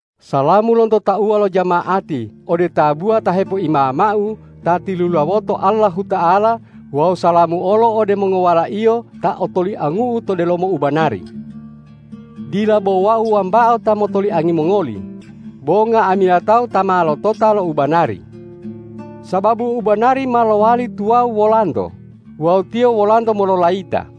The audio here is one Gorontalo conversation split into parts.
Salamu lonto tauwa lo jama'ati ode tabuwa ta hepoimamau ta tilulawoto Allahuta'ala wawu salamu olo ode mongowalaiyo ta otoliangu'u to delomo ubanari. Dila bo wau wambao ta motoliangi mongoli, bo nga'amila tawu ta ma lotota lo u banari. Sababu ubanari ma lowali tuwawu wolanto wawu tiyo wolanto mololayita.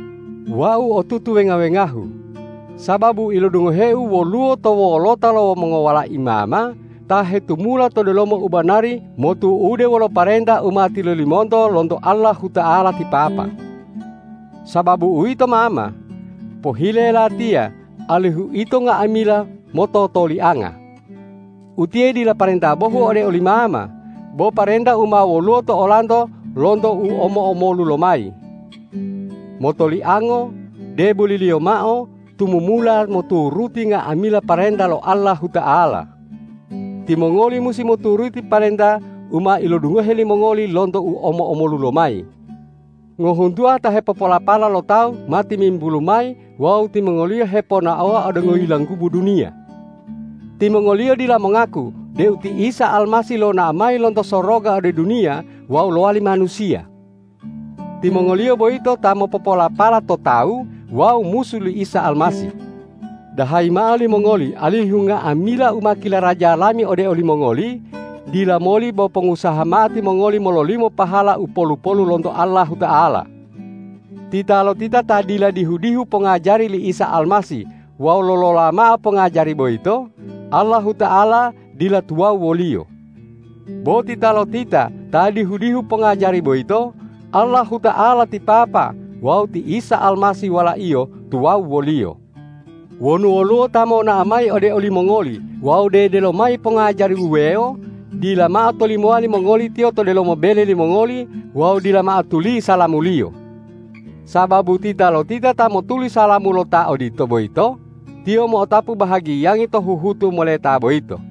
Wau otutu wenga-wengahu, sababu ilodungoheu woluwo to wolota lo mongowalai mama ta hetumula to delomo ubanari motu'ude wolo parenta u ma tilolimonto lonto Allahuta'ala ti Papa. Sababu uwito mama, pohile latiya alihu ito nga'amila mototolianga. Utiye dila parenta bohu ode oli mama, bo parenta u ma woluwo to olanto lonto u omo-omolu lomayi. Motoliango, deboliliyo mao tumumula moturuti nga'amila parenta lo Allahuta'ala. Timongoli musi moturuti parenta u ma ilodungohe limongoli lonto u omo-omolu lomayi. Ngohuntuwa ta hepopolapala lo tawu ma timimbulu mayi wawu timongoliyo heponaowa ode ngoyilanggubu duniya. Timongoliyo dila mongaku deu ti Isa Almasih lonao mayi lonto soroga ode duniya wawu lowali manusiya. Timongoliyo boyito ta mopopolapala to tawu wawu musu li Isa Almasih. Dahayi mao limongoli alihu nga'amila u ma kilaraja lami ode olimongoli, dila moli bo pongusaha mao timongoli mololimo pahala u polu-polu lonto Allahuta'ala. Titalotita ta dila dihu-dihu pongajari li Isa Almasih wawu lolola mao pongajari boyito, Allahuta'ala dila tuwawu woliyo. Bo titalotita ta dihu-dihu pongajari boyito, Allahuta'ala ti Papa wawu ti Isa Almasih Wala-Iyo tuwawu woliyo. Wonu woluwo ta monao mayi ode olimongoli wawu dedelo mayi pongajari wuwewo, dila mao tolimowa limongoli tiyo to delomo bele limongoli wawu dila mao tuli salamuliyo. Sababu titalotita ta motuli salamu lo ta odito boyito, tiyo mo'otapu bahagiyangi to huhutu moleta boyito.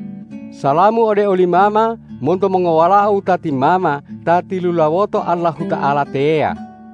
Salamu ode oli mama monto mongowalao wutati mama ta tilulawoto Allahuta'ala teya.